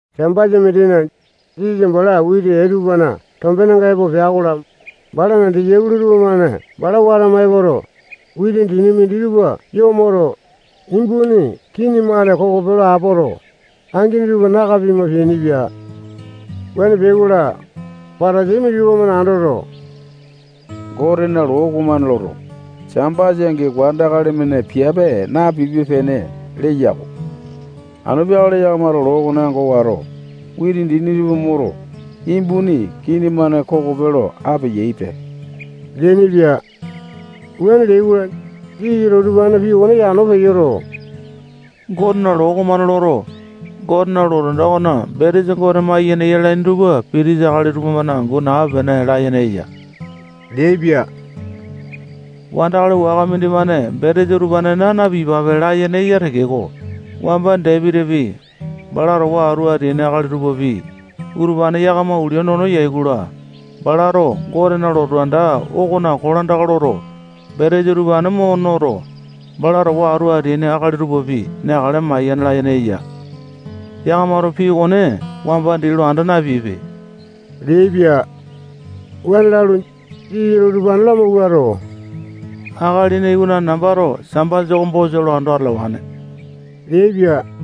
Sambasa mindina, Jisasa bala witi ee tupana tombenenga epo peai-kola, balana disaipolo tupamane bala watama epoto, witi dini minditupa yo moto, imbuni kini-mane kokope lo apoto, angini tupa naka pima peainipia. Wuane peai-kola, Patasai minditupa-mane andoto, Gotena loo okomane loto, Sambasa angi wandakali-mane piape napipe-pene leya-ko. Anu peakale yakamato loo okone ango wato, witi dini tupa moto, imbuni kini-mane kokope lo apeyaipe leainipia. Wuane leai-kola, Jisasato utupanena pii okone yano peyoto, Gotena loo okomane loto, Gotena lotu anda okona betesa Gote maiyene yalaini tupa pitisa akali tupamane angu nape-pene layene eya leaipia. Wandakali waka mindimane betesa utupane naa na-piyapape layene eya tekeko, wamba Dapitipi, bala towa atu ateaini akali tupapi, utupane yakama ulia nono yai-kola, balato Gotena lotu anda okona kolandaka loto, betesa utupane mo noto, bala towa atu ateaini akali tupapi neakale mayane layene eya. Yakamato pii okone wamba dii lo anda napeaipe leaipia. Wuane lalu, Jisasato utupane lamawuato, Akalina Iwanane nambato Sambasa oko bosa lo ando atalawane leaipia.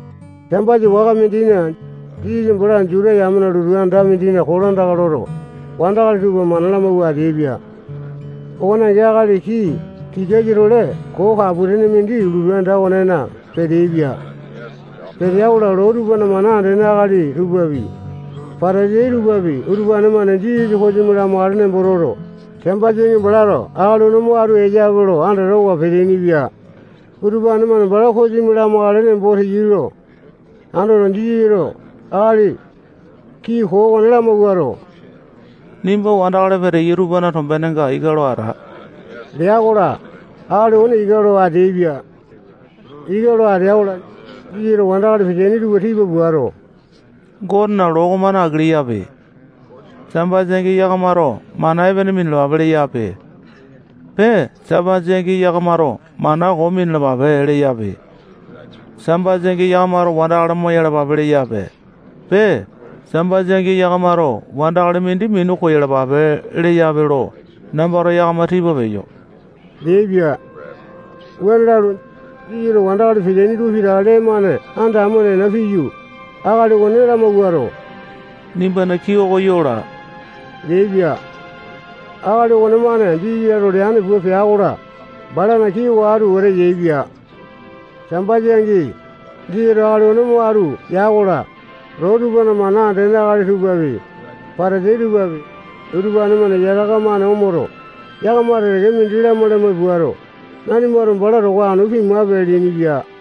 Sambasa waka mindina, Jisasa bala Juta yamena lotu anda mindina kolandaka loto, wandakali tupa mana lamawua ateaipia. Okone angi akali kii tikasa-tole koo kapu-tene mindi lotu anda okonena peteaipia. Petea-kola, loo tupana mana andene akali tupapi, Patasai tupapi, utupane-mane Jisasa kosimi lamakale nembo toto, Sambasa angi balato akali okone mo atu eyape lo andatawa peteaini-pia. Utupane-mane bala kosimi lamakale nembo teyai lo andoto, Jisasato akali kii koo okone lamawuato, nimba wandakali peteyai tupana tombenenga ika lo ata lea-kola, akali okone ika lo ateaipia. Ika lo atea-kola, Jisasato wandakali peteaini tupa tipa puato, Gotena loo okomane aki leyape. Sambasa angi yakamato mana epene minalapape leyape. Pee, Sambasa angi yakamato mana koo minalapape leyape. Sambasa angi yakamato wandakali moyalapape leyape. Pee, Sambasa angi yakamato wandakali mindi minu koyalapape leyape lo nambato yakama tipa peyo leaipia. Wuane lalu, Jisasato wandakali peteaini tupa pitaka lee-mane anda amo nena piyu, akali okone lamawuato, nimbana kii oko yo laa leaipia. Akali okonemane Jisasato leane pua pea-kola, balana kii oko atu wete yaepia. Sambasa angi, Jisasato akali okone mo atu ya-kola, loo tupana mana andene akali tupapi, Patasai tupapi, utupane-mane yataka-mane omoto, yakama teke-teke mindi lamai-lamai puato, nanimato bala towa anu pimape leainipia.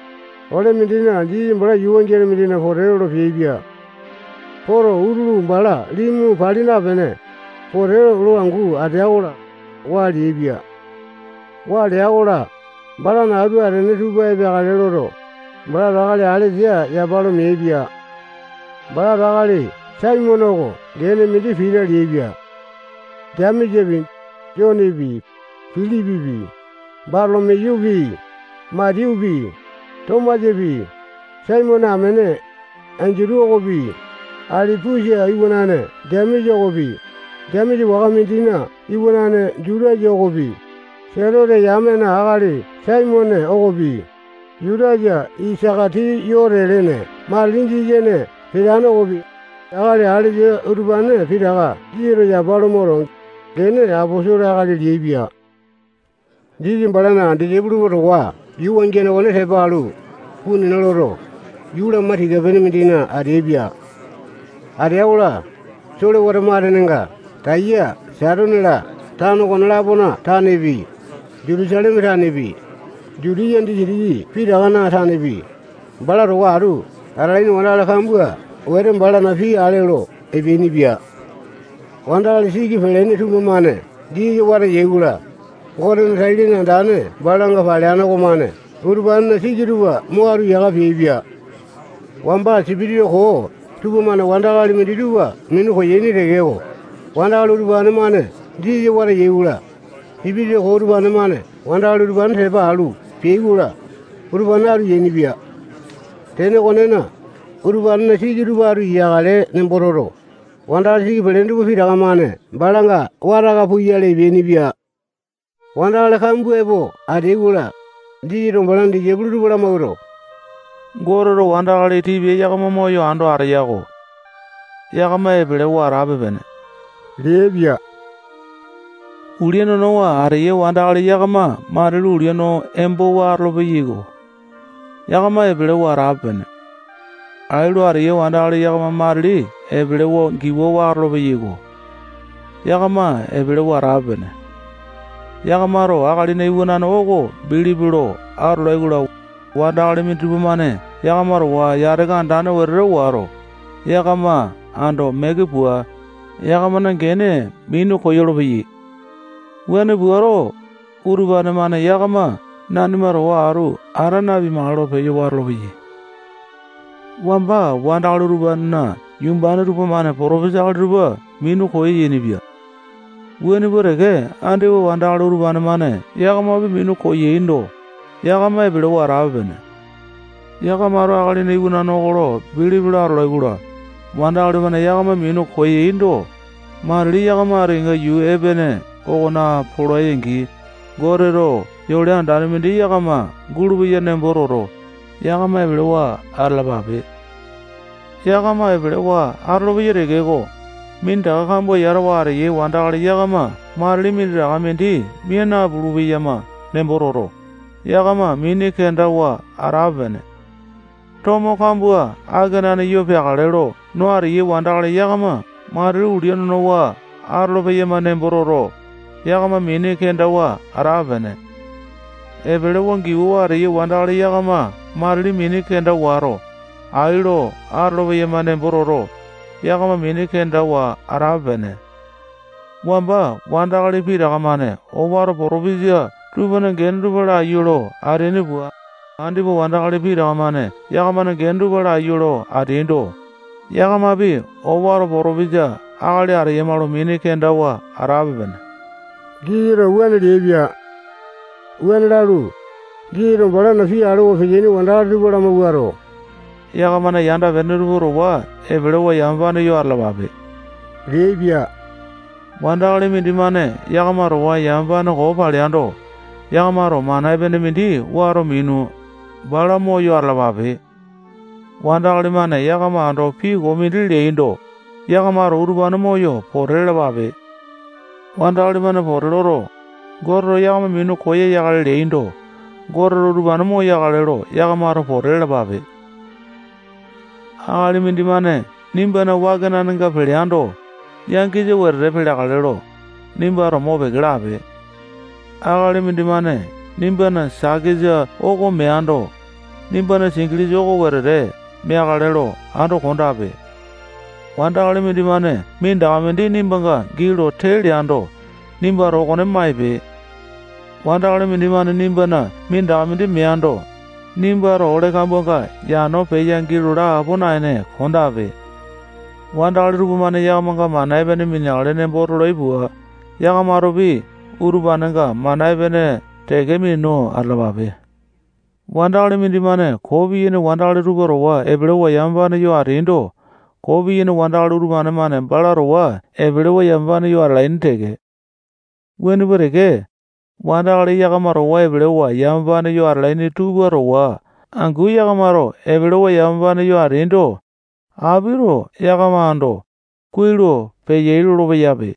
Ole mindina Jisasa bala yuu wangiane mindina pote lolo peaipia. Poto, utulu bala limu pali napene, pote angu lo atea-kola, waa leaipia. Waa lea-kola, balana atu atene tupa epeakale loto, balato akali alesa yapa lo meaipia. Balato akali Saimone oko gene mindi Pita leaipia. Jemesapi, Jonepi, Pilipipi, Batolo-miyupi, Matiyupi, Tomasapi, Saimone amene Endutu okopi, Alipusa iwanane Jemesa okopi, Jemesa waka mindina iwanane Jutasa okopi, Selote yamena akali Saimone okopi, Jutasa Isaka-tiyote lene matili Jisasa ene peteane okopi, akali alesa utupane pitaka Jisasato yapa lo moto, gene aposolo akali leaipia. Jisasa balana disaipolo tupa towa yuu wangiane okone tepa alu, puu nena loto, yuu lama tika-pene mindina ateaipia. Atea-kola, solewata matenenga Taya, Saitone-la, tano okone-lapona tanepi, Jutusaleme tanepi, Jutiya disitiki pitakana tanepi, bala towa atu atalaini wandakali kambua wete balana pii ale olo epeainipia. Wandakali siki palene tupamane Jisasa wata yai-kola, Gotena tai-lene andane balanga paleane okomane utupanena siki tupa mo atu yaka peaipia. Wamba sipitisa koo tupamane wandakali minditupa minu koyaini tekeko, wandakali utupane-mane Jisasa wata yai-kola, sipitisa koo utupane-mane wandakali utupane tepa alu peai-kola, utupane atu yainipia. Tene okonena, utupanena siki tupa atu yakale nembo toto, wandakali siki pelene tupa pitaka-mane balanga wata aka puyale epeainipia. Wandakali kambua epo ateai-kola, Jisasato balana disaipolo tupa lamawuato, Goteto wandakali tipia yakama moyo ando ateya-ko. Yakama epelewa atape-pene leaipia. Ulia nonowa ateyai wandakali yakama matili ulia no embowa atolo-peyaiko. Yakama epelewa atape-pene. Ai lo ateyai wandakali yakama matili epelewa giwawa atolo-peyaiko. Yakama epelewa atape-pene. Yakamato Akalina Iwanane oko bilipi lo atolai-kola, wandakali minditupa-mane yakama towa yataka andane wete wato, yakama ando meke pua, yakamana gene minu koyolo-peyai. Wuane puato, utupane-mane yakama nanima towa atu ata napimakale lo peyo watolo-peyai. Wamba wandakali utupanena yumbane tupamane potopesa akali tupa minu koyainipia. Wuane pua teke andipa wandakali utupane-mane yakamapi minu koyaindo, yakama epelewa atape-pene. Yakamato Akalina Iwanane oko bilipi lo atolai-kola, wandakali-mane yakama minu koyaindo, matili yakama ati kenga yuu epene okona polai-angi, Goteto yole andane mindi yakama gulupeya nembo toto, yakama epelewa atalapape. Yakama epelewa atolopeyai tekeko, minditaka kambua yatawa ateyai wandakali yakama matili minditaka mindi mia napulu-peyama nembo toto, yakama mini kendawa atape-pene. Tomo kambua akenane yo peakale lo no ateyai wandakali yakama matili ulia nonowa atolo-peyama nembo toto, yakama mini kendawa atape-pene. Epelewa, giwawa ateyai wandakali yakama matili mini kenda wato, ai lo atolo-peyama nembo toto, yakama mini kendawa atape-pene. Wamba wandakali pitaka-mane owato potopisa tupana gene tupa laiyu lo ateaini pua, andipa wandakali pitaka-mane yakamana gene tupa laiyu lo ateaindo, yakamapi owato potopesa akali ateyama lo mini kendawa atape-pene. Jisasato wuane leaipia. Wuane lalu, Jisasato balana pii alewa ateaini wandakali tupa lamawuato, yakamana yanda-pene tupa towa epelewa, yamapane yo atalapape leaipia. Wandakali mindimane yakama towa yamapane koo paleando, yakamato mana epene mindi wato minu, bala moyo atalapape. Wandakali-mane yakama ando pii koo mindi leando, yakamato utupane moyo pote lalapape. Wandakali-mane poto loto, Goteto yakama minu koyakale leaindo, Goteto utupane moyakale lo yakamato pote lalapape. Akali mindimane nimbana wakenanenga peleando, yangisa wetete peleakale lo, nimbato mopeke lape. Akali mindimane nimbana sakesa oko meando, nimbana singilisa oko wetete meakale lo ando kondape. Wandakali mindimane minditaka mindi nimbanga gii lo tee leando, nimbato okone maipe. Wandakali mindimane nimbana minditaka mindi meando, nimbato ole kambuanga yano peyo gii laa apo naene kondape. Wandakali tupamane yakamanga mana epene mineakale nembo tolai pua, yakamatopi utupanenga mana epene teke minu atalapape. Wandakali mindimane koo piyaini wandakali tupa towa epelewa yamapane yo ateando, koo piyaini wandakali utupane-mane bala towa epelewa yamapane yo atalaini teke. Wuane pua teke, wandakali yakama towa epelewa yamapane yo atalaini tupa towa angu yakamato epelewa yamapane yo ateaindo, apito yakama ando, kuai lo peyai lolo-peyape.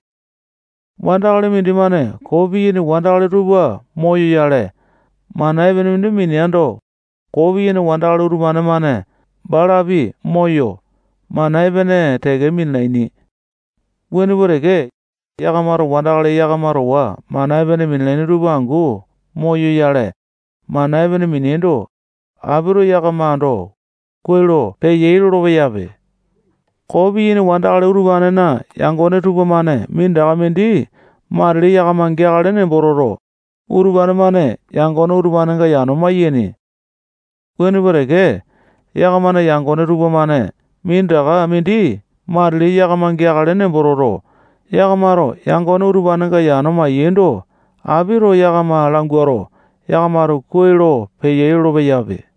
Wandakali mindimane koo piyaini wandakali tupa moyoyale, mana epene mindi mineando, koo piyaini wandakali utupane-mane balapi moyo, mana epene teke minalaini. Wuane pua teke, yakamato wandakali yakama towa mana epene minalaini tupa angu moyoyale, mana epene mineaindo, apito yakama ando, kuai lo peyai lolo-peyaipe. Koo piyaini wandakali tupanena yangone tupamane minditaka mindi matili yakama geakale nembo toto, utupane-mane yangone utupanenga yano maiyaini. Wuane pua teke, yakamana yangone tupamane minditaka mindi matili yakama geakale nembo toto, yakamato yangone utupanenga yano mai-yaindo, apito yakama languato, yakamato kuai lo peyai lolo-peyaipe.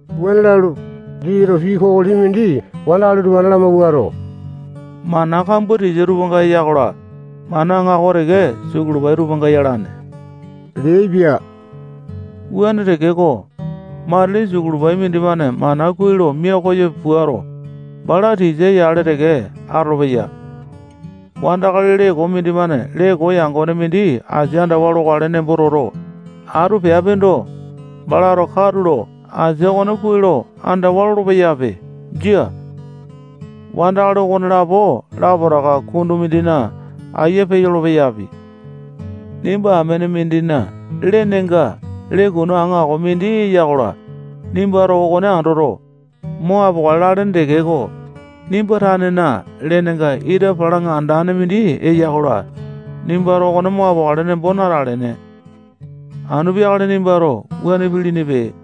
Wuane lalu, Jisasato pii kokoli mindi wandakali utupane lamawuato, mana kambua tisa tupanga eya-kola, mana aŋako teke sukulu-pai tupanga yalane leaipia. Wuane tekeko, matili sukulu pai mindimane mana kuai lo mia koyo puato, bala tisa yale teke atolopeya. Wandakali lee koo mindimane lee koo yangone mindi asia andawa lokale nembo toto, atu peapindo, balato katulo asia okone kuai lo andawa lolo-peyape. Jia. Wandakali okonelapo lapotaka kundu mindina ayia peyolo-peyapi. Nimba amene mindina lenenga lee kunu aŋako mindi eya-kola, nimbato okone andoto, mo apokale lalene tekeko, nimba tanena lenenga ita palaŋa andane mindi eya-kola, nimbato okone mo apokale nembo natalene. Anu peakale nimbato wuane pilinipe.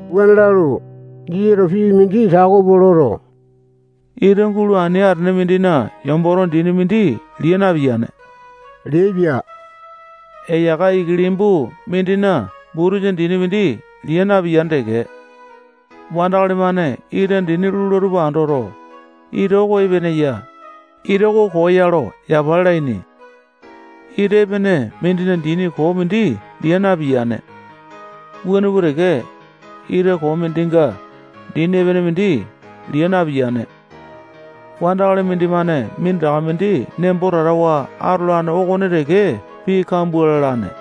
Wuane lalu, Jisasato pii mindi tako pua loto, ita gulu ani atene mindina yomboto dini mindi lia napiyane leaipia. Eyaka ikilimbu mindina butusa dini mindi lia napiyane teke. Wandakali-mane ita dini lula tupa andoto, ita oko epene ya, ita oko koo ya lo yapa lalaini. Ita epene mindinga dini koo mindi liya napiyane. Wuane pua teke, ita koo mindinga dini epene mindi liya napiyane. Wandakali mindimane minditaka mindi nembo tatawa atolane okone teke pii kambua lalane.